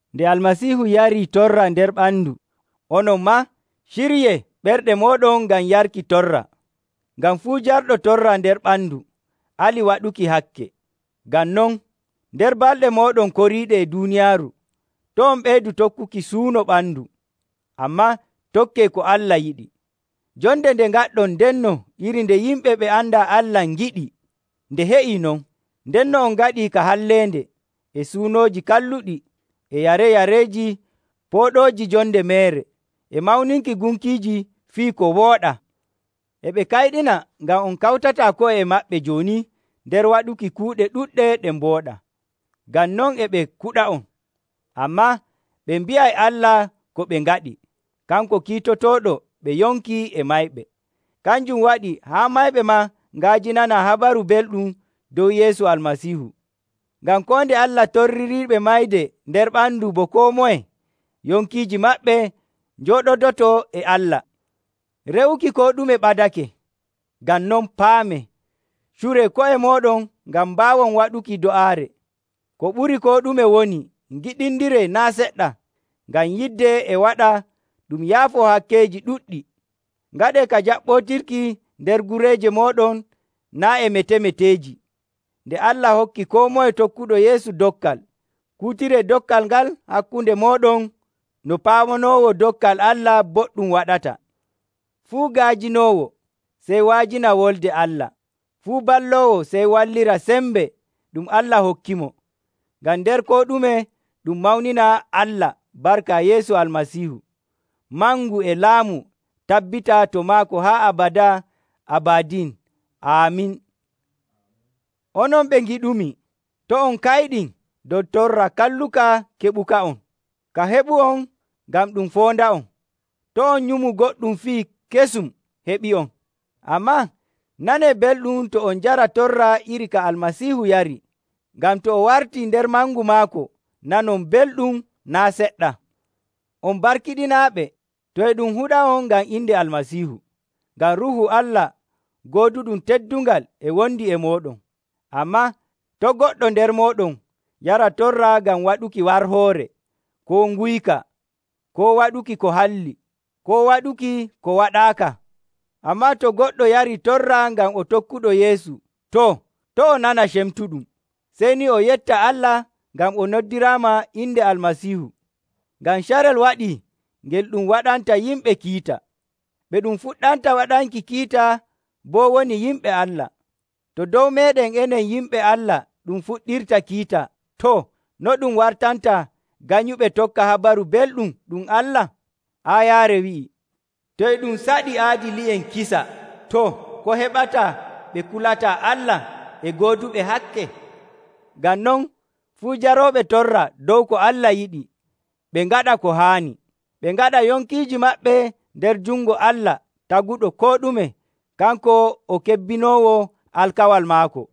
Nde Almasiihu yarii torra nder ɓandu, onon maa ciryee ɓerɗe mooɗon ngam yarki torra. Ngam fuu jarɗo torra nder ɓandu, alii waɗuki hakke. Ngam non, nder balɗe mooɗon koriiɗe e duuniyaaru, to' on ɓeydu tokkuki suuno ɓandu, ammaa tokkee ko Allah yiɗi. Jonde nde ngaɗɗon ndenno iri nde yimɓe ɓe andaa Allah ngiɗi, nde heƴii non. Ndenno on ngaɗi ka halleende, e suunooji kalluɗi, e yareyareeji pooɗooji jonde meere, e mawninki gunkiiji fii koo wooɗaa. E ɓe kayɗina ngam on kawtataa ko'e e maɓɓe jooni nder waɗuki kuuɗe ɗuɗɗe ɗe mbooɗaa. Ngam non e ɓe kuɗa'on. Ammaa ɓe mbi'ay Allah ko ɓe ngaɗi, kanko kiitotooɗo ɓe yonki e mayɓe. Kanjum waɗi haa mayɓe maa nga'ajinanaa Habaru Belɗum dow Yeesu Almasiihu. Ngam koo nde Allah torririiɓe mayde nder ɓandu bo koo moye, yonkiiji maɓɓe njooɗodoto e Allah. Re'uki koo ɗume ɓadake. Ngam non paamee, curee ko'e mooɗon ngam mbaawon waɗuki do'aare. Ko ɓuri koo ɗume woni, ngiɗindiree naa' seɗɗa, ngam yidde e waɗa ɗum yaafoo hakkeeji ɗuɗɗi. Ngaɗee ka jaɓɓootirki nder gureeje mooɗon naa' e metemeteeji. Nde Allah hokki koo moye tokkuɗo Yeesu dokkal, kuutiree dokkal ngal hakkunde mooɗon no paamanoowo dokkal Allah boɗɗum waɗata. Fuu ga'ajinoowo, sey wa'ajina Wolde Allah. Fuu balloowo sey wallira sembe ɗum Allah hokkimo, ngam nder koo ɗume ɗum mawnina Allah barka Yeesu Almasiihu. Mangu e laamu tabbita to maako haa abadaa abadin. Aamin. Onon ɓe ngiɗumi, to' on kayɗin dow torra kalluka keɓuka'on. Ka heɓu'on ngam ɗum foonda'on. To' on nyumu goɗɗum fii kesum heɓii'on. Ammaa nanee belɗum to on njara torra iri ka Almasiihu yari, ngam to o wartii nder mangu maako nanon belɗum naa' seɗɗa. On barkiɗinaaɓe, to e ɗum huɗa'on ngam inde Almasiihu, ngam Ruuhu Allah gooduɗum teddungal e wondi e mooɗon. Ammaa to' goɗɗo nder mooɗon yara torra ngam waɗuki warhoore, koo nguyka, koo waɗuki ko halli, koo waɗuki ko waɗaaka. Ammaa to goɗɗo yarii torra ngam o tokkuɗo Yeesu, too, to' o nana cemtuɗum, sey ni o yetta Allah ngam o noddiraama inde Almasiihu. Ngam carel waɗii ngel ɗum waɗanta yimɓe kiita. Ɓe ɗum fuɗɗanta waɗanki kiita boo woni yimɓe Allah. To dow meeɗen enen yimɓe Allah ɗum fuɗɗirta kiita, too, no ɗum wartanta ganyuɓe tokka Habaru Belɗum ɗum Allah? Aayaare wi'ii, “To e ɗum saɗi aadili'en kisa, too, ko heɓata ɓe kulataa Allah e gooduɓe hakke?” Ngam non, fuu jarooɓe torra dow ko Allah yiɗi, ɓe ngaɗa ko haani. Ɓe ngaɗa yonkiiji maɓɓe nder jungo Allah Taguɗo koo ɗume. Kanko o kebbinoowo alkawal maako.